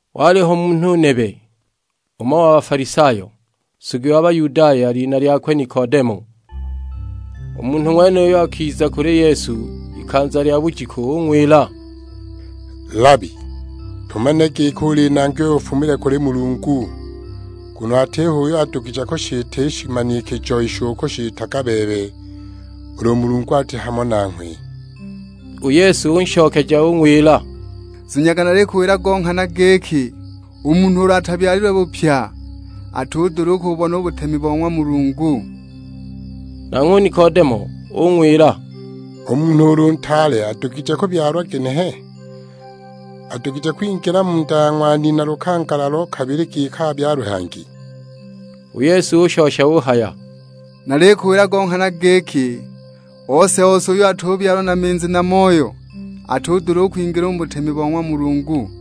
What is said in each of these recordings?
Waliho munhu nebe, umo wa Bafalisayo, nsugi wa Bayudaya; lina lyakwe Nikodemo. U munhu ng'wenuyo akiza kuli Yesu ikanza lya bujiku ung'wila, "Labi, tumanile giki uli Nangi uyo afumile kuli Mulungu, nguno atiho uyo adugije kushita i shimanikijo isho ukushitaga bebe, ulu Mulungu ati hamo nanghwe!" U Yesu unshokeja ung'wila, "Zunyaga nalikuwila go nghana giki, u munhu ulu atabyalilwe bupya, atudula u kububona u butemi bo ng'wa Mulungu." Nanghwe u Nikodemo ung'wila, "U munhu ulu ntaale adugije kubyalwa ginehe? Adugije kwingila mu nda ya ng'wa nina lukangala lo kabili giki abyalwe hangi?" U Yesu ushosha uhaya, "Nalikuwila go nghana giki, ose-ose uyo atubyalwa na minzi na Moyo, atudula u kwingila u mu butemi bo ng'wa Mulungu.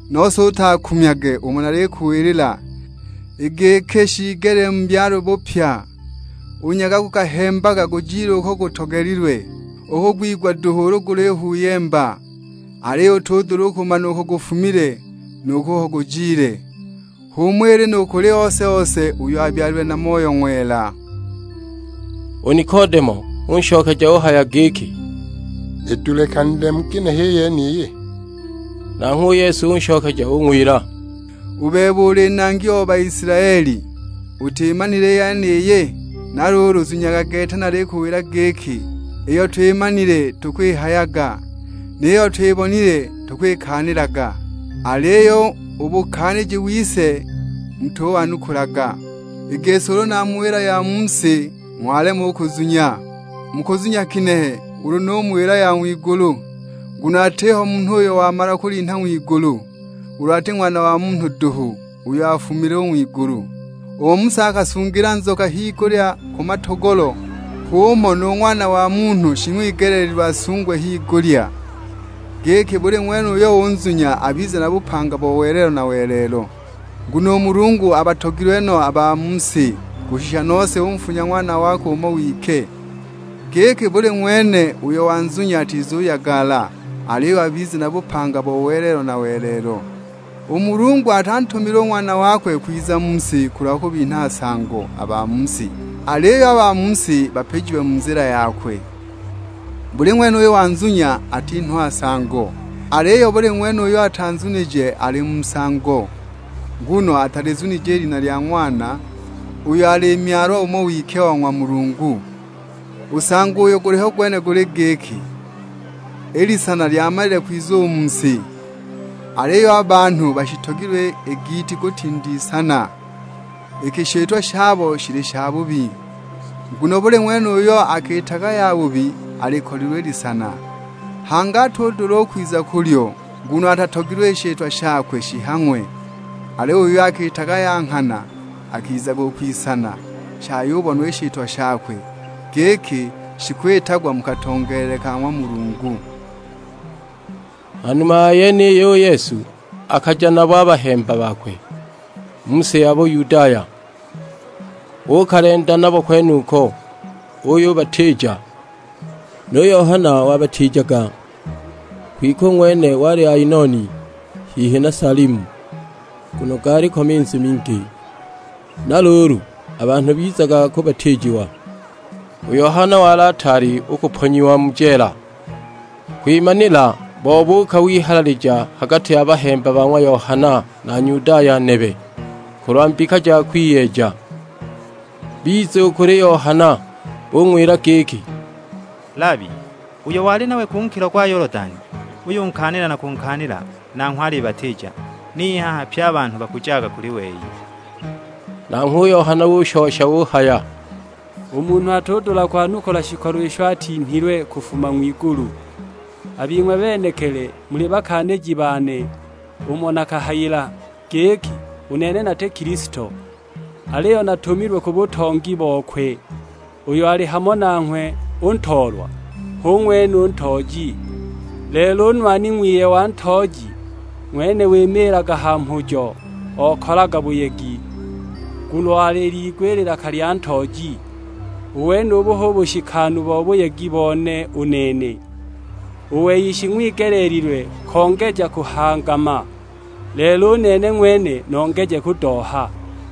Nose utakumyage umo nalikuwilila, i giki shiigelile mubyalwe bupya. U nyaga gukahembaga gujile uko gutogelilwe, ukugwigwa duhu ulu gulihuyemba, aliyo utudula u kumana uko gufumile, nu kuko gujile; h'umo ili nu kuli ose-ose uyo abyalilwe na Moyo Ng'wela!" U Nikodemo unshokeja uhaya giki, "Idulikanile mu ginehe i yeniyi?" Nanghwe u Yesu unshokeja ung'wila, "U bebe uli nangi o Baisilaeli, utimanile i yeniyi? Na luulu zunyaga gete nalikuwila giki, iyo twimanile tukwihayaga, ni yiyo twibonile tukwikaanilaga, aliyo u bukaaniji wise mutuwanukulaga. I gisi ulu namuwila ya mu si ng'walema u kuzunya, mukuzunya ginehe ulu numuwila ya ng'wigulu? Nguno atiho munhu uyo wamala kulinha ng'wigulu, ulu ati Ng'wana wa Munhu duhu, uyo afumile u ng'wigulu. Umo Musa akasungila nzoka higulya ku matogolo, h'umo nu Ng'wana wa Munhu shing'wigeleelilwe asungwe higulya; giki buli ng'wene uyo unzunya abize na bupanga bo welelo na welelo. Nguno u Mulungu abatogilwe no a ba mu si, kushisha nose unfunya Ng'wana wakwe umo wike; giki buli ng'wene uyo unzunya atizuyagala, aliyo abize na bupanga bo welelo na welelo. U Mulungu atantumile u Ng'wana wakwe kwiza mu si kulwa kubinha nsango a ba mu si, aliyo a ba mu si bapijiwe mu nzila yakwe. Buli ng'wene uyo unzunya atinhwa nsango, aliyo buli ng'wene uyo atanzunije ali mu nsango: nguno atalizunije i lina lya Ng'wana, uyo ali Myalwa umo wike wa ng'wa Mulungu. U nsango uyo guliho gwene guli giki, i lisana lyamalile kwiza u mu si, aliyo a banhu bashitogilwe i giiti kutinda i lisana, iki i shitwa shabo shili shabubi. Nguno buli ng'wene uyo akiitaga yabubi alikolilwe i lisana, hangi atudula u kwiza u kulyo, nguno atatogilwe i shitwa shakwe shihang'we. Aliyo uyo akiitaga ya nghana, akizaga u kwisana, shayubonwa i shitwa shakwe, giki shikwitagwa mu katongeelele ka ng'wa Mulungu." Ha numa ya yeniyo u Yesu akaja nabo a bahemba bakwe mu si ya Buyudaya, uukalenda nabo kwenuko, uyubatiija. Nu Yohana wabatiijaga, kwike u ng'wene wali Ainoni hihi na Salimu, nguno gaaliko minzi mingi. Na luulu a banhu bizaga kubatiijiwa, u Yohana wali ataali u kuponyiwa mu jeela. Kwimanila bobuuka wihalalija ha gati ya bahemba ba ng'wa Yohana na Nyudaya nebe, kulwa mbika ja kwiyeeja. Biza u kuli Yohana bung'wila giki, "Labi, uyo wali nanghwe ku nkilo gwa Yolodani, uyunkaanila na kunkaanila, nanghwe alibatiija; niyo i haha pye a banhu bakujaga kuli wei." Nanghwe u Yohana ushosha uhaya, "U munhu atudula kwanukula shikolo isho atinhilwe kufuma ng'wigulu. A bing'we benekili muli bakaaniji bane umo nakahayila, giki u nene nati Kilisto, aliyo natumilwe ku butongi bokwe. Uyo ali hamo nanghwe u Ntoolwa, hu ng'wene u Ntooji; lelo u nwani ng'wiye wa Ntooji, ng'wene wimiilaga ha mhujo; okalaga buyegi, nguno aliliigwa i lilaka lya Ntooji. U wenubu hu bushikanu bo buyegi bone u nene. U wei shing'wigeleelilwe kongeja kuhangama, lelo u nene ng'wene nongeje kudoha."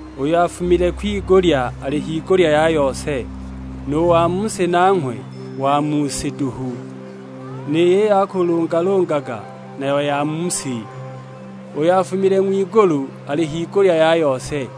"Uyo afumile kwigulya ali higulya ya yose; nu wa mu si nanghwe wa mu si duhu, ni yiyo akalungalungaga nayo ya mu si. Uyo afumile ng'wigulu ali higulya ya yose;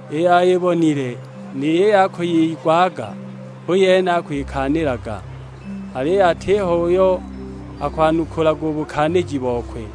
iyo ayibonile ni yiyo akwiyigwaga hu yene akwikaanilaga, aliyo atiho uyo akuwanukulaga u bukaaniji bokwe.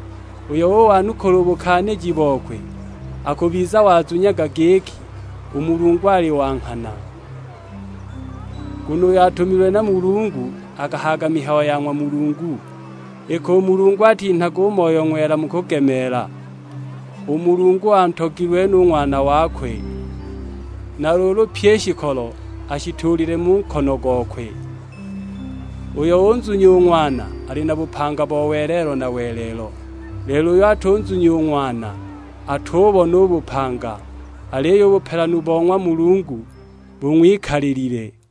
Uyo uwanukula u bukaaniji bokwe, akubiza wazunyaga giki, u Mulungu ali wa nghana. Nguno uyo atumilwe na Mulungu akahayaga mihayo ya ng'wa Mulungu, iki u Mulungu atinhaga u Moyo Ng'wela mu kugemeela. U Mulungu nuulu: Siswe antogilwe no u Ng'wana wakwe, na luulu pyi i shikolo ashituulile mu nkono gokwe. Uyo unzunya u Ng'wana ali na bupanga bo welelo na welelo, lelo uyo atunzunya u Ng'wana, atububona u bupanga, aliyo u bupelanu bo ng'wa Mulungu bung'wikalilile!"